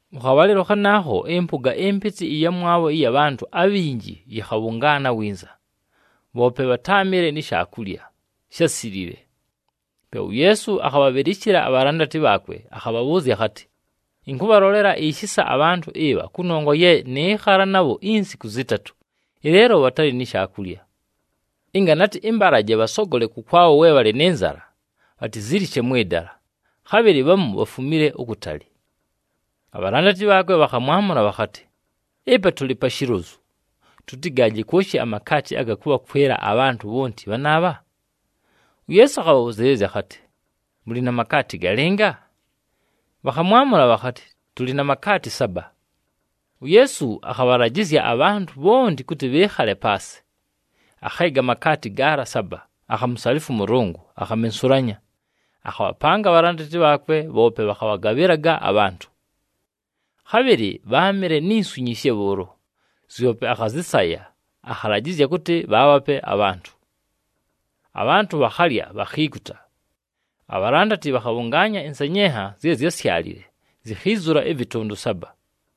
Mʉ khabhalɨlo khanaakho, ɨmpʉga ɨmpɨtɨ ɨyamwabho ɨya bhantʉ abhinji yɨkhabhʉngaana winza, bhoope bhatáamɨle ni shaakulya, shásilile. Pe uYeesu akhabhabhɨlɨshɨla abhalandati bhaakwe akhabhabhʉʉzya akhatɨ, “Ɨnkʉbhalolela ishisa abhantʉ ɨbha kʉnongwa ye nɨɨkhala nabho insiku zɨtatʉ, ɨleelo bhatalɨ ni shaakulya. Ɨnga natɨ ɨmbalaje bhasogole kʉkwabho we bhalɨ nɨ nzala, bhatizilishe mwɨ dala, khabhɨlɨ bhamu bhafumile ukutali.” Abhalandati bhaakwe bhakhamwamʉla bhakhatɨ, “Ɨpa tʉlɨ pa shilozu, tʉtɨgaaje kwoshi amakaati aga kʉbhakwɨla abhantʉ bhonti bhanaabha?” UYeesu akhabhabhʉzɨɨlɨzya akhatɨ, “Mʉlɨ na makaati galɨnga?” Bhakhamwamʉla bhakhatɨ, “Tʉlɨ na makaati saba.” UYeesu akhabhalajɨzya abhantʉ bhonti kʉtɨ bhɨɨkhale paasɨ. Akheega amakaati gaala saba, akhamusalifwa ʉMʉlʉngʉ, akhamensulanya. Akhabhapanga abhalandati bhaakwe, bhoope bhakhabhagabhɨlaga abhantʉ. Khabhɨlɨ bháamɨle ni nswi nyishe bhʉʉlo. Zyope akhazɨsaya, akhalajɨzya kʉtɨ bhaabhape abhantʉ. Abhantʉ bhakhalya, bhakhiikuta. Abhalandati bhakhabhʉngaanya ɨnsenyenha zye zyásyalile, zikhiizula ɨvɨtʉndʉ saba.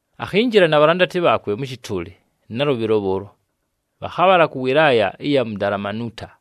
Akhinjila na bhalandati bhaakwe mʉ shɨtʉʉlɨ nalʉbhɨlo bhʉʉlo, bhakhabhala kʉ wɨlaaya ɨya mu Dalamanuuta.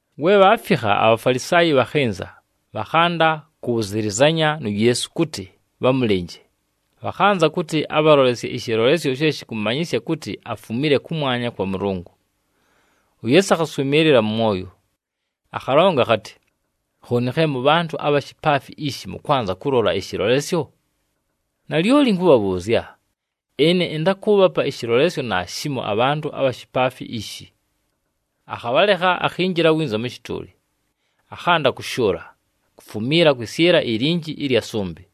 We bhaafikha, aBhafalisaayi bhakhɨnza, bhakhanda kʉbhʉzɨlɨzanya nu Yeesu kʉtɨ bhamʉlɨnje, bhakhanza kʉtɨ abhalolesye ɨshɨlolesyo she shɨkʉmanyɨsya kʉtɨ afumile kʉmwanya kwa Mʉlʉngʉ. UYeesu akhaswɨmɨɨlɨla mʉ mwoyo. Akhalonga akhatɨ, “Khooni khe mʉbhantʉ abha shipaafi ishi mʉkwanza kʉlola ɨshɨlolesyo? Nalyoli ɨnkʉbhabhʉʉzya, ɨne ɨntakʉʉbhapa ɨshɨlolesyo naashimo abhantʉ abha shipaafi ishi.” Akhabhalekha, akhinjila winza mʉ shɨtʉʉlɨ. Akhanda kʉshʉʉla, kufumiila kwɨsyɨla ilinji ɨlya sʉmbɨ.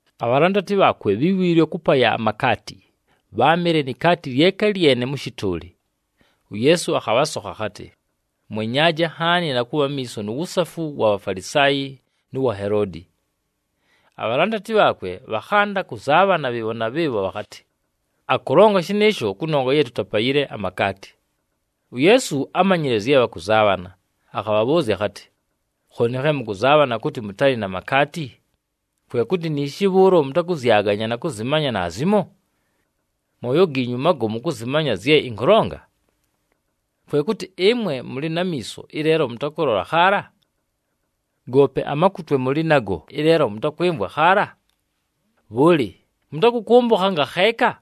Abhalandati bhaakwe bhíwiilwe kʉpaya amakaati. Bháamɨle ni kaati lyeka lyene mʉ shɨtʉʉlɨ. UYeesu akhabhasokha akhatɨ, “Mwenyaaje nhaani na kʉbha amiiso nu wusafu wa Bhafalisaayi nʉ wa Heloodi.” Abhalandati bhaakwe bhakhanda kʉzaabhana bhɨɨbho na bhɨɨbho bhakhatɨ, “Akʉlonga shɨnɨɨsho kʉnongwa ye tutapayile amakaati.” UYeesu ámanyile zye bhakʉzaabhana, akhabhabhʉʉzya akhatɨ, “Khooni khe mʉkʉzaabhana kʉtɨ mʉtalɨ na makaati? Kwe kʉtɨ niishi bhʉʉlo mʉtakʉzyaganya na kʉzɨmanya naazimo? Mooyo giinyu magomu kʉzɨmanya zye ɨnkʉlonga? Kwe kʉtɨ ɨmwe mʉlɨ na miiso, ɨleelo mʉtakʉlola khaala? Goope amakutwe mʉlɨ nago, ɨleelo mʉtakwɨmvwa khaala? Bhʉlɨ, mʉtakʉkʉmbʉkha ngakheeka?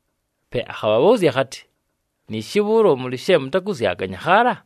Pe akhabhabhʉʉzya akhatɨ, “Niishi bhʉʉlo mʉlɨ she mʉtakʉzyaganya khaala?”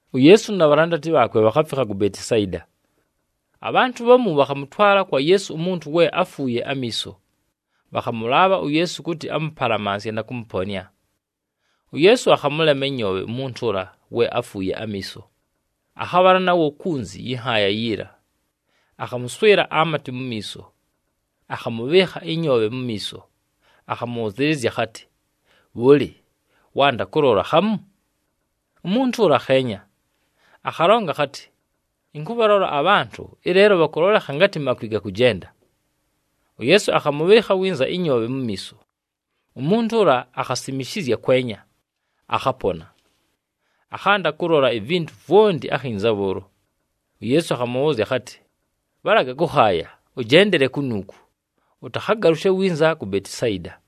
UYeesu na bhalandati bhaakwe bhakhafikha ku Betisayida. Abhantʉ bhamu bhakhamʉtwala kwa Yeesu umuntu we áfuuye amiiso. Bhakhamʉlaabha uYeesu kʉtɨ amʉpalamansye na kʉmʉponɨa. UYeesu akhamʉlema ɨnyoobhe umuntu ʉla we áfuuye amiiso, akhabhala nawo kunzi yɨ nhaaya yiila. Akhamʉswɨla amatɨ mu miiso, akhamʉbhɨɨkha ɨnyoobhe mu miiso, akhamʉbhʉzɨɨlɨzya akhatɨ, “Bhʉlɨ, wanda kʉlola khamu?” Umuntu ʉla akheenya, akhalonga akhatɨ, “Ɨnkʉbhalola abhantʉ, ɨleelo bhakʉlolekha ngatɨ makwi gakʉjenda.” UYeesu akhamʉbhɨɨkha winza ɨnyoobhe mu miiso, umuntu ʉla akhasimishizya kwenya, akhapona. Akhanda kʉlola ivintu vwonti akhinza bhʉʉlo. UYeesu akhamʉbhʉʉzya akhatɨ, “Bhalaga kʉkhaaya, ʉjendele kunuuku, ʉtakhagalʉshe winza ku Betisayida.”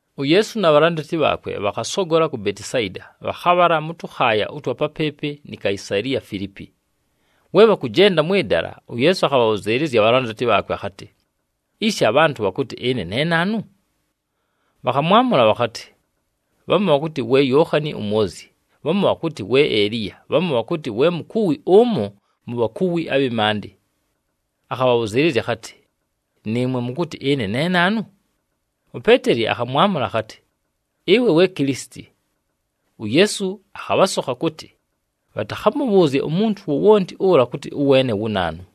UYeesu na bhalandati bhaakwe bhakhasogola ku Betisayida, bhakhabhala mʉ tʉkhaaya ʉtwa papɨɨpɨ ni Kaisaliya Filiipi. We bhakʉjenda mwɨ dala, uYeesu akhabhabhʉzɨɨlɨzya abhalandati bhaakwe akhatɨ, “Ishi abhantʉ bhakʉtɨ ɨne ne naanu?” Bhakhamwamʉla bhakhatɨ, “Bhamu bhakʉtɨ we Yookhani uMwozyi, bhamu bhakʉtɨ we Eliya, bhamu bhakʉtɨ we mukuwi ʉmo mu bhakuwi abhɨ maandɨ.” Akhabhabhʉzɨɨlɨzya akhatɨ, “Nɨɨmwe, mʉkʉtɨ ɨne ne naanu?” UPeeteli akhamwamʉla akhatɨ, “Ɨwe we Kilisiti.” UYeesu akhabhasokha kʉtɨ bhatakhamʉbhʉʉzye umuntu wowonti ʉla kʉtɨ ʉweene wu naanu.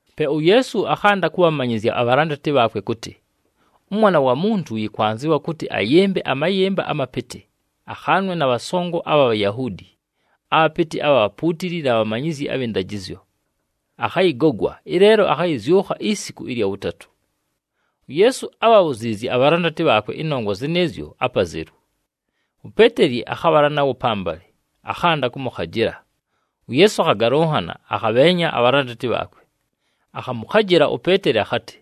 Pe uYeesu akhanda kʉbhamanyɨzya abhalandati bhaakwe kʉtɨ, “ɄMwana wa Muntu yɨkwanzɨwa kʉtɨ ayɨmbe amayɨmba amapɨtɨ, akhaanwe na bhasongo abha Bhayahuudi, abhapɨtɨ abha bhapuutili na bhamanyizyi abhɨ ndajɨzyo. Akhayɨgogwa, ɨleelo akhayɨzyʉkha isiku ɨlya wʉtatʉ.” UYeesu ábhabhuziizye abhalandati bhaakwe ɨnongwa zɨnɨɨzyo apazelu. UPeeteli akhabhala nawo pambalɨ, akhanda kʉmʉkhajɨla. UYeesu akhagalʉnhana, akhabheenya abhalandati bhaakwe. Akhamʉkhajɨla uPeeteli akhatɨ,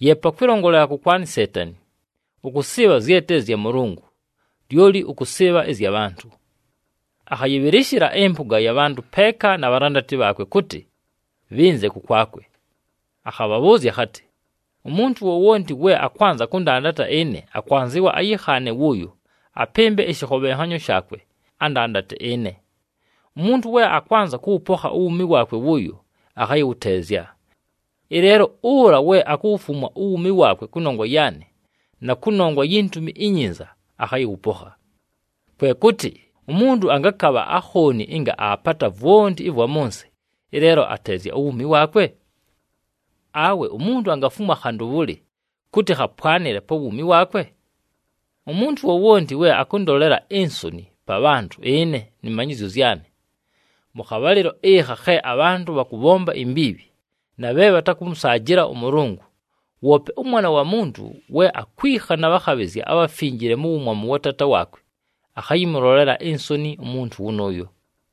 “Yeepa kwɨlongolela kʉkwanɨ Seetani, ʉkʉsɨɨbha zye te zya Mʉlʉngʉ, lyoli ʉkʉsɨɨbha ɨzya bhantʉ.” Akhayɨbhɨlɨshɨla ɨmpʉga ya bhantʉ peeka na bhalandati bhaakwe kʉtɨ, bhɨnze kʉkwakwe. Akhabhabhʉʉzya akhatɨ, “Umuntu wowonti we akwanza kʉndandata ɨne, akwanzɨwa ayɨkhaane wʉʉyo, apɨmbe ɨshɨkhobhenhanyo shaakwe, andandate ɨne. Umuntu we akwanza kʉwʉpokha uwuumi waakwe wʉʉyo, akhayɨwʉteezya. Ɨleelo ʉla we akuwufumwa uwuumi waakwe kʉnongwa yaanɨ, na kʉnongwa yi Ntumi iNyinza, akhayɨwʉpokha. Kwe kʉtɨ umuntu angakabha akhooni ɨnga aapata vwonti ɨvwa mʉ nsɨ, ɨleelo ateezya uwuumi waakwe? Awe umuntu angafumwa khantʉ bhʉlɨ kʉtɨ khapwanɨle pa wuumi waakwe? Umuntu wowonti we akʉndolela insoni pa bhantʉ ɨne nɨ manyɨzyo zyanɨ, mʉ khabhalɨlo ɨkha khe abhantʉ bhakʉbhomba imbiibhi na bhe bhatakʉmʉsaajɨla ʉMʉlʉngʉ, woope ʉMwana wa Muntu we akwikha na bhakhabhɨzya abhafinjile mu wumwamu wa Taata waakwe, akhayɨmʉlolela insoni umuntu wʉnʉʉyo.”